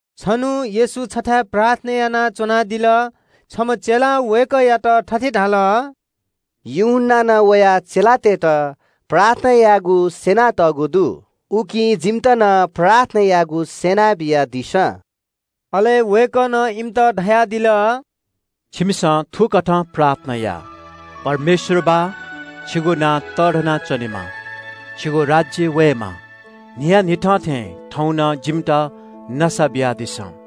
छन्हु येशू छथाय् प्रार्थना यानाच्वनादिल। छम्ह चेलां वय्कःयात थथे धाल – “यूहन्नां नं वया चेलातय्त प्रार्थना यायेगु स्यं थें हे जिमित नं प्रार्थना यायेगु स्यनाबियादिसँ।” अले वय्कलं इमित धयादिल – “छिमिसं थुकथं प्रार्थना या – “‘परमेश्वर बाः छिगु नां तःधना च्वनेमा। छिगु राज्य वयेमा। न्हियान्हिथं थें थौं नं जिमित नसा बियादिसँ।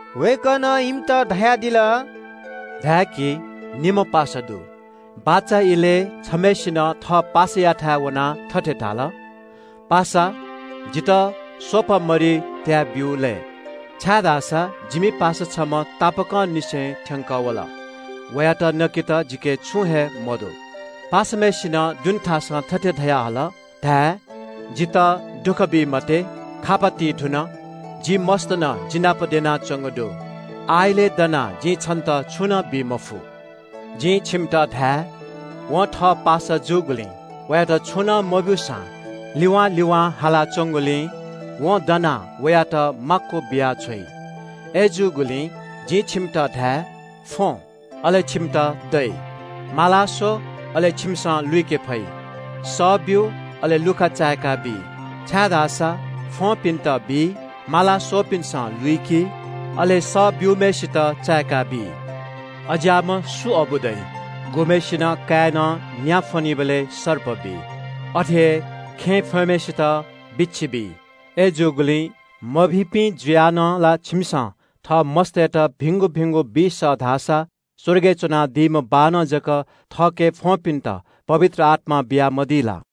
वय्कलं इमित धयादिल – “धाय्की, निम्ह पासा दु। बाचा इलय् छम्हसिनं थः पासायाथाय् वनाः थथे धाल – ‘पासा, जितः स्वपा मरि त्याय् ब्यु लय्, छाय्धाःसा जिमि पासा छम्ह तापाकंनिसें थ्यंकः वल। वयात नकेत जिके छुं हे मदु।’ पासाम्हय्सिनं दुने थासं थथे धयाहल धाये – ‘जितः दुःख बी मते। खापा ति धुन। जि मस्त नं जिनापं द्यनाच्वंगु दु। आः इलय् दनाः जिं छन्त छुं नं बी मफु।’ जिं छिमित धाये – वं थः पासा जूगुलिं वयात छुं नं मब्यूसां तिवां तिवां हालाच्वंगुलिं वं दनाः वयात माक्व बियाछ्वइ। “अय्जूगुलिं जिं छिमित धाये – फ्वँ, अले छिमित दइ, माला स्व, अले छिमिसं लुइके फइ, सः ब्यु, अले लुखा चाय्काबी। छाय्धाःसा फ्वंपिन्त बी, माला स्वःपिन्सं लुइकी, अले सः ब्यूम्हय्सित चाय्काबी। “अज्याःम्ह सु अबु दइ? गुम्हय्सिनं काय्नं न्या फ्वनीबलय् सर्प बी? अथे हे खेँय् फ्वंम्हय्सित बिच्छी बी? अय्जूगुलिं मभिंपिं जुयाः नं ला छिमिसं थः मस्तय्त भिंगु भिंगु बी सः धाःसा स्वर्गय् च्वनादीम्ह बाःनं जक थःके फ्वंपिन्त पवित्र आत्मा बियामदी ला?”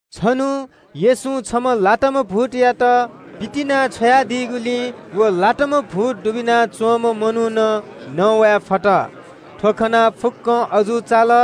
छन्हु येशूं छम्ह लाताम्ह भूतयात पितिना छ्वयादीगुलिं व मनुखं न्ववाये फत। थ्व खनाः फुक्क मनूत अजू चाल।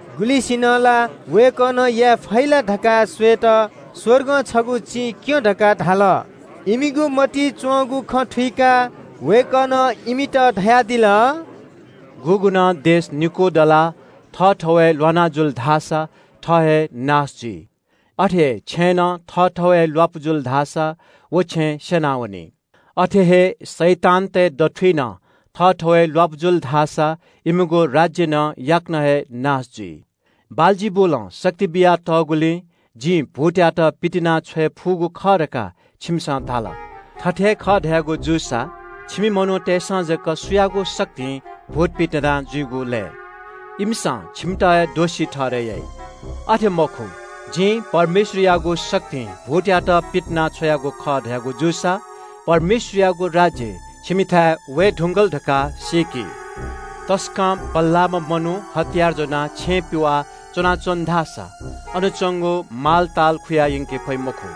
गुलिंसिनं ला वय्कलं याये फइ ला धकाः स्वयेत स्वर्गं छगू चिं क्यँ धकाः धाल। इमिगु मतिइ च्वंगु खँ थुइकाः वय्कलं इमित धयादिल – “गुगुं नं राज्य निकू दलाः थःथवय् ल्वाना जुल धाःसा थः हे नाश जुइ। अथे हे छेँय् नं थःथवय् हे ल्वापु जुल धाःसा व छेँ स्यनावनी। अथे हे शैतानतय् दथुइ नं थःथवय् ल्वापु जुल धाःसा इमिगु राज्य नं याकनं हे नाश जुइ। बालजिबुलं शक्ति बियातःगुलिं जिं भूतयात पितिनाछ्वये फुगु खः धकाः छिकपिन्सं धाल। थथे हे खः धयागु जूसा छिकपिनि मनूतय्सं जक सुयागु शक्तिं भूत पितिना जुइगु लय्? इमिसं छिकपिन्त हे दोषी ठहरय् याइ। अथे मखु, जिं परमेश्वरयागु शक्तिं भूतयात पितिनाछ्वयागु खः धयागु जूसा परमेश्वरयागु राज्य छिकपिन्थाय् वये धुंकल धकाः सीकादिसँ। तसकं बल्लाःम्ह मनू हतियार ज्वनाः छेँ पिवाः च्वनाच्वन धाःसा अन च्वंगु मालताल खुया यंके फइ मखु।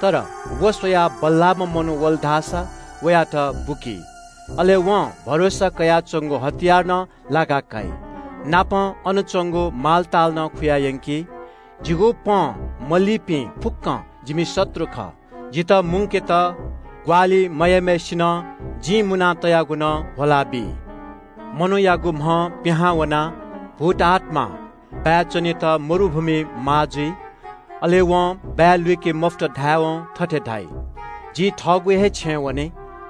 तर व स्वयाः बल्लाःम्ह मनू वल धाःसा वयात बुकी। अले वं भरोसा कयाच्वंगु हतियार नं लाका काइ, नापं अन च्वंगु मालताल नं खुयायंकी। “जिगु पँ मलीपिं फुक्कं जिमि शत्रु खः। जितः मुंकेत ग्वाहालि मयाइम्हय्सिनं जिं मुना तयागु नं ह्वलाबी।” “मनूयागु म्हं पिहां वनाः भूतआत्मां बाय् च्वनेत मरुभूमिइ माः जुइ। अले वं बाय् लुइके मफुत धायेवं थथे धाइ – ‘जि पिहां वयागु थःगु हे छेँय् वने।’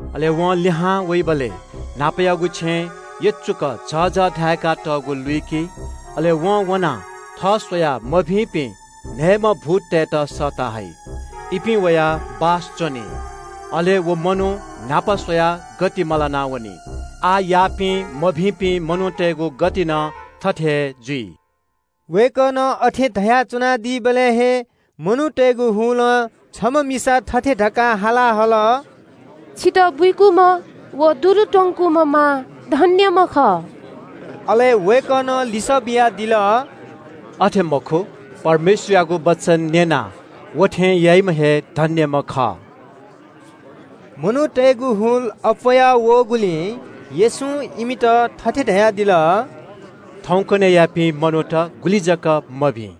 अले वं लिहां वइबलय् न्हापायागु छेँ यचुकाः झःझः धाय्कातःगु लुइकी। अले वं वनाः थः स्वयाः मभिंपिं न्हय्म्ह भूततय्त सःता हइ। इपिं वयाः बासं च्वनी। अले व मनू न्हापा स्वयाः गति मलाना वनी। आःयापिं मभिंपिं मनूतय्गु गति नं थथे हे जुइ।” वय्कलं अथे धयाच्वनादीबलय् हे मनूतय्गु हुलं छम्ह मिसा थथे धकाः हाला हल – “छितः बुइकूम्ह व दुरु त्वंकूम्ह मां धन्यम्ह खः।” अले वय्कलं लिसः बियादिल – “अथे मखु, परमेश्वरयागु वचन न्यनाः व थें याइम्ह हे धन्यम्ह खः।” मनूतय्गु हुल अप्वःया वःगुलिं येशूं इमित थथे धयादिल – “थौंकन्हय्यापिं मनूत गुलि जक मभिं।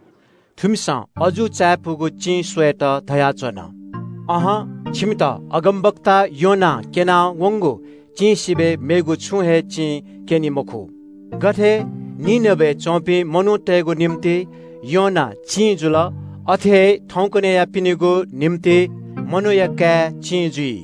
थुमिसं अजू चायापुगु चिं स्वयेत धयाच्वन। अहं, थुमित अगमवक्ता योनां क्यना वंगु चिं सिबय् मेगु छुं हे चिं क्यनी मखु। गथे निनवेय् च्वंपिं मनूतय्गु निंतिं योना चिं जुल, अथे हे थौंकन्हय्यापिनिगु निंतिं मनूया काय् चिं जुइ।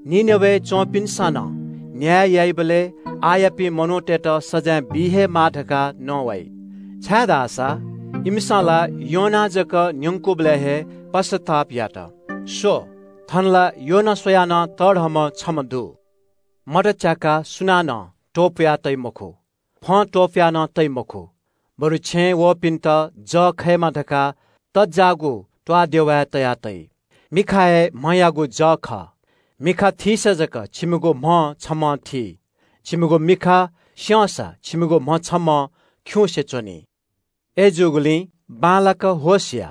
निनवेय् च्वंपिन्सं नं न्याय याइबलय् आःयापिं मनूतय्त सजाँय बी हे माः धकाः नवाइ, छाय्धाःसा इमिसं ला योनां जक न्यंकूबलय् हे पश्चाताप यात। स्व, थन ला योना स्वयाः नं तःधंम्ह छम्ह दु।” “मत च्याकाः सुनानं सुचुका तइ मखु, फं त्वपुया नं तइ मखु, बरु छेँय् वःपिन्त जः खयेमा धकाः तज्जाःगु थासय् तया तइ। “मिखा हे म्हयागु जः खः। मिखा थीसा जक छिमिगु म्ह छम्हं थी। छिमिगु मिखा स्यंसा छिमिगु म्ह छम्हं खिउँसे च्वनी। अय्जूगुलिं बांलाक होश या,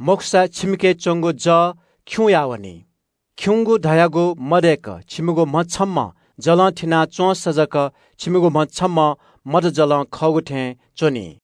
मखुसा छिमिके च्वंगु जः खिउँया वनी। खिउँगु धयागु मदय्क छिमिगु म्ह छम्हं जलं थिना च्वंसा जक छिमिगु म्ह छम्हं मत जलं खःगु थें च्वनी।”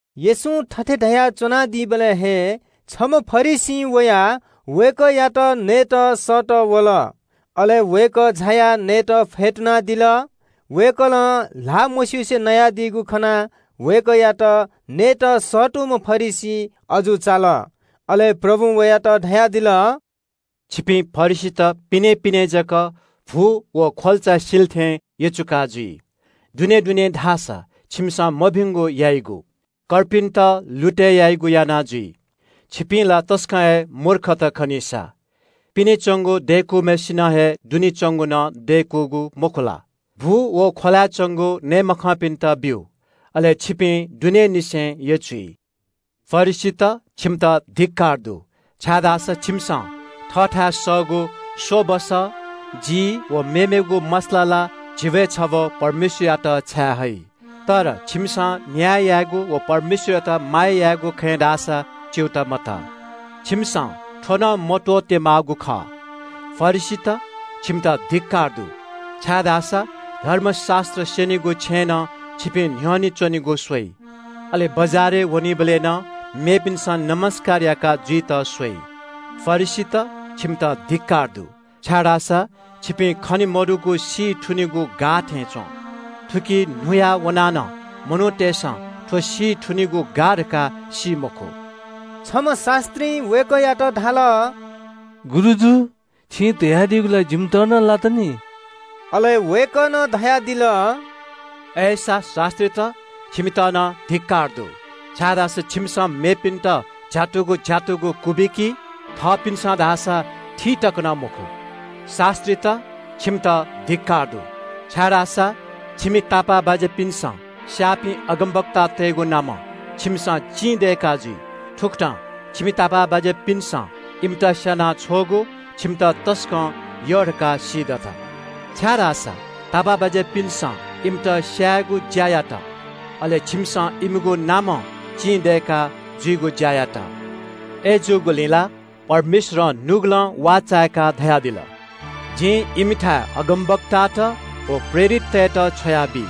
येशूं थथे धयाच्वनादीबलय् हे छम्ह फरिसीं वयाः वय्कःयात भ्वय् नयेत सःतः वल। अले वय्कः झायाः नयेत फ्यतुनादिल। वय्कलं ल्हाः मस्युसे नयादीगु खनाः वय्कःयात सःतूम्ह फरिसी अजू चाल। अले प्रभुं वयात धयादिल – “छिपिं फरिसीत पिनें पिनें जक भु व ख्वल्चा सिले थें यचुका जुइ। दुनें दुनें धाःसा छिमिसं मभिंगु यायेगु, कर्पिन्त लुतय् यायेगु याना जुइ। छिपिं ला तसकं हे मूर्खत खनीसा। पिने च्वंगु दय्कूम्हय्सिनं हे दुने च्वंगु नं दय्कूगु मखु ला? भु व ख्वलाय् च्वंगु नये मखंपिन्त ब्यु, अले छिपिं दुनेंनिसें यचुइ।” “फरिसीत, छिमित धिक्कार दु, छाय्धाःसा छिमिसं थःथाय् सःगु नवःघाँय्, जी व मेमेगु मसला ला झिब्वय् छब्व परमेश्वरयात छाये हइ। तर छिमिसं न्याय यायेगु व परमेश्वरयात माया यायेगु खँय् धाःसा च्यूताः मतः। छिमिसं थ्व नं मत्वःते माःगु खः। “फरिसीत, छिमित धिक्कार दु, छाय्धाःसा धर्मशास्त्र स्यनीगु छेँय् नं छिपिं न्ह्यःने च्वनेगु स्वइ, अले बजारय् वनीबलय् नं मेपिन्सं ज्वजलपा याका जुइत स्वइ। फरिसीत, छिमित धिक्कार दु, छाय्धाःसा छिपिं खने मदुगु सी थुनिगु गाः थें च्वं। थुकी न्हुया वनाः मनूतय्सं थ्व सी थुनिगु गाः धकाः सी मखु।” छम्ह शास्त्रीं वय्कःयात धाल – “गुरुजु छिं धयादीगु ला जिमित नं लात नि।” अले वय्कलं धयादिल – “अय्सा शास्त्रीत, छिमित नं धिक्कार दु, छाय्धाःसा छिमिसं मेपिन्त झ्यातुगु झ्यातुगु कु क्वबिकी, थःपिन्सं धाःसा थी तक नं मखु। शास्त्रीत, छिमित धिक्कार दु, छाय्धाःसा छिमि तापाःबाज्यापिन्सं स्याःपिं अगमवक्तातय्गु नामं छिमिसं लुमन्तिया चिं दय्का जुइ। थुकथं छिमि तापाःबाज्यापिन्सं इमित स्याना छ्वःगु छिमित तसकं यः धकाः सीदत, छाय्धाःसा तापाःबाज्यापिन्सं इमित स्यायेगु ज्या यात, अले छिमिसं इमिगु नामं लुमन्तिया चिं दय्का जुइगु ज्या यात। अय्जूगुलिं ला परमेश्वरं नुगलं वाःचाय्काः धयादिल – ‘जिं इमिथाय् अगमवक्तात व प्रेरिततय्त छ्वयाबी।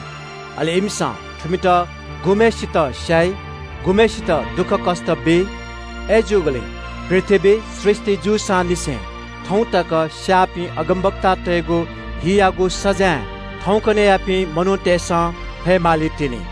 अले इमिसं थुमित गुम्हय्सितं स्याइ, गुम्हय्सितं दुःखकष्ट बी।’ “अय्जूगुलिं पृथ्वी सृष्टि जूसांनिसें थौं तक स्याःपिं अगमवक्तातय्गु हियागु सजाँय थौंकन्हय्यापिं मनूतय्सं फये मालीतिनि।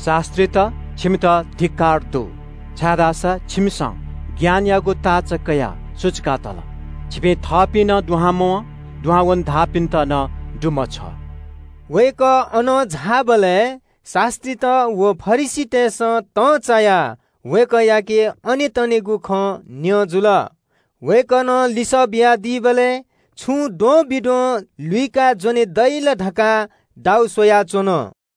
“शास्त्रीत, छिमित धिक्कार दु, छाय्धाःसा छिमिसं ज्ञानयागु ताःचा कयाः सुचुका तल। छिपिं थःपिं नं दुहां मवं, दुहां वने धाःपिन्त नं दुमछ्वः।” वय्कः अनं झाःबलय् शास्त्रीत व फरिसीतय्सं तंचायाः वय्कःयाके अनेतनेगु खँ न्यं जुल। वय्कलं लिसः बियादीबलय् छुं द्वंबिद्वं लुइकाः ज्वने दइ ला धकाः दाउ स्वयाच्वन।